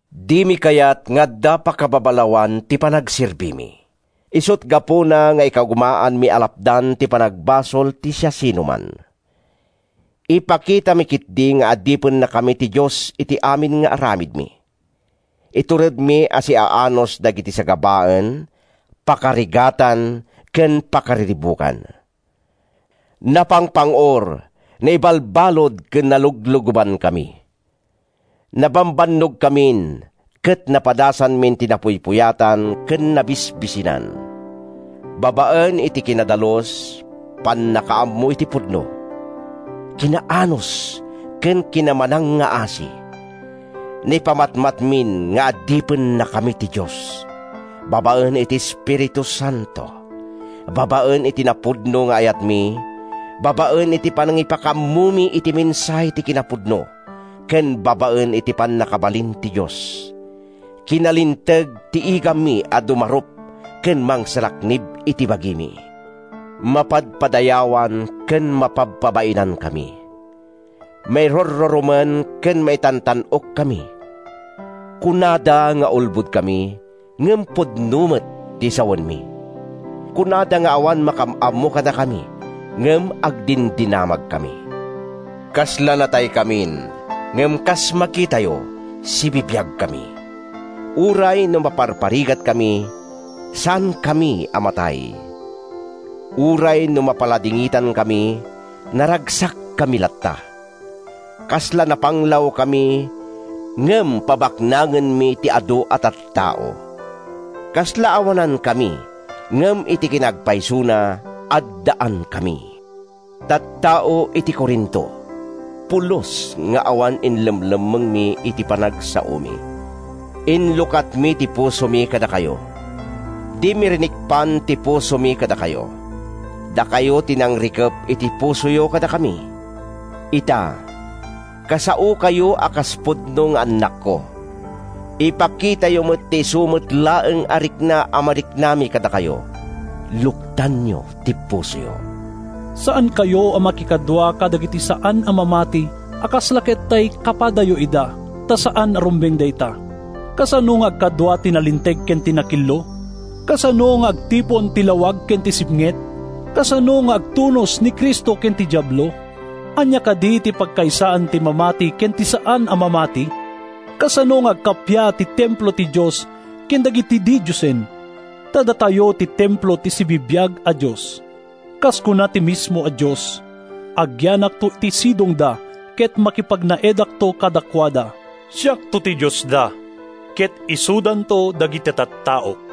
Dimi kayat nga adda pakababalawan ti panagserbimi. Isut’ gapuna nga ikagumaanmi a lapdan ti panagbasol ti siasinoman. Ipakitami ketdi nga adipennakami ti Dios iti amin nga aramidmi. Ituredmi a siaanus dagiti sagabaen, pakarigatan ken pakariribukan. Napangpang-or, naibalbalud ken naluglugobankami. Nabambannogkamin, ket napadasanmin ti napuypuyatan ken nabisbisinan. Babaen iti kinadalus, pannakaammo iti pudno, kinaanus ken kinamanangngaasi, naipamatmatmin nga adipennakami ti Dios; babaen iti Espiritu Santo, babaen iti napudno nga ayatmi, babaen iti panangipakaammomi iti mensahe ti kinapudno ken babaen iti pannakabalin ti Dios. Kinalinteg ti igammi a dumarup ken mangsalaknib iti bagimi. Mapadpadayawan ken mapabpabainankami. Mairurrurumen ken maitantan-okkami. Kunada nga ulbodkami, ngem pudno met ti sawenmi. Kunada nga awan makaam-ammo kadakami, ngem agdindinamagkami. Kasla nataykamin, ngem kas makitayo, sibibiagkami. Uray no maparparigatkami, saankami a matay. Uray no mapaladingitankami, naragsakkami latta. Kasla napanglawkami, ngem pabaknangenmi ti adu a tattao. Kasla awanankami, ngem iti kinaagpaysona, addaankami. Tattao iti Corinto, pulos nga awan inlemmengmi iti panagsaomi. Inlukatmi ti pusomi kadakayo. Dimi rinikpan ti pusomi kadakayo. Dakayo ti nangrikep iti pusoyo kadakami. Ita, kasaokayo a kas pudno nga annakko: ipakitayo met ti isu met laeng a rikna a mariknami kadakayo. Luktanyo ti pusoyo! Saankayo a makikadua kadagiti saan a mamati a kasla ket tay kapadayo ida, ta saan a rumbeng dayta. Kasano nga agkadua ti nalinteg ken ti nakillo? Kasano nga agtipon ti lawag ken ti sipnget? Kasano nga agtunos ni Cristo ken ti Diablo? Ania kadi ti pagkaysaan ti mamati ken ti saan a mamati? Kasano nga agkappia ti templo ti Dios ken dagiti didiosen? Ta datayo ti templo ti sibibiag a Dios. Kas kuna ti mismo a Dios: “Agyanakto iti sidongda ket makipagnaedakto kadakuada, Siakto ti Diosda ket isudanto dagiti tattaok.”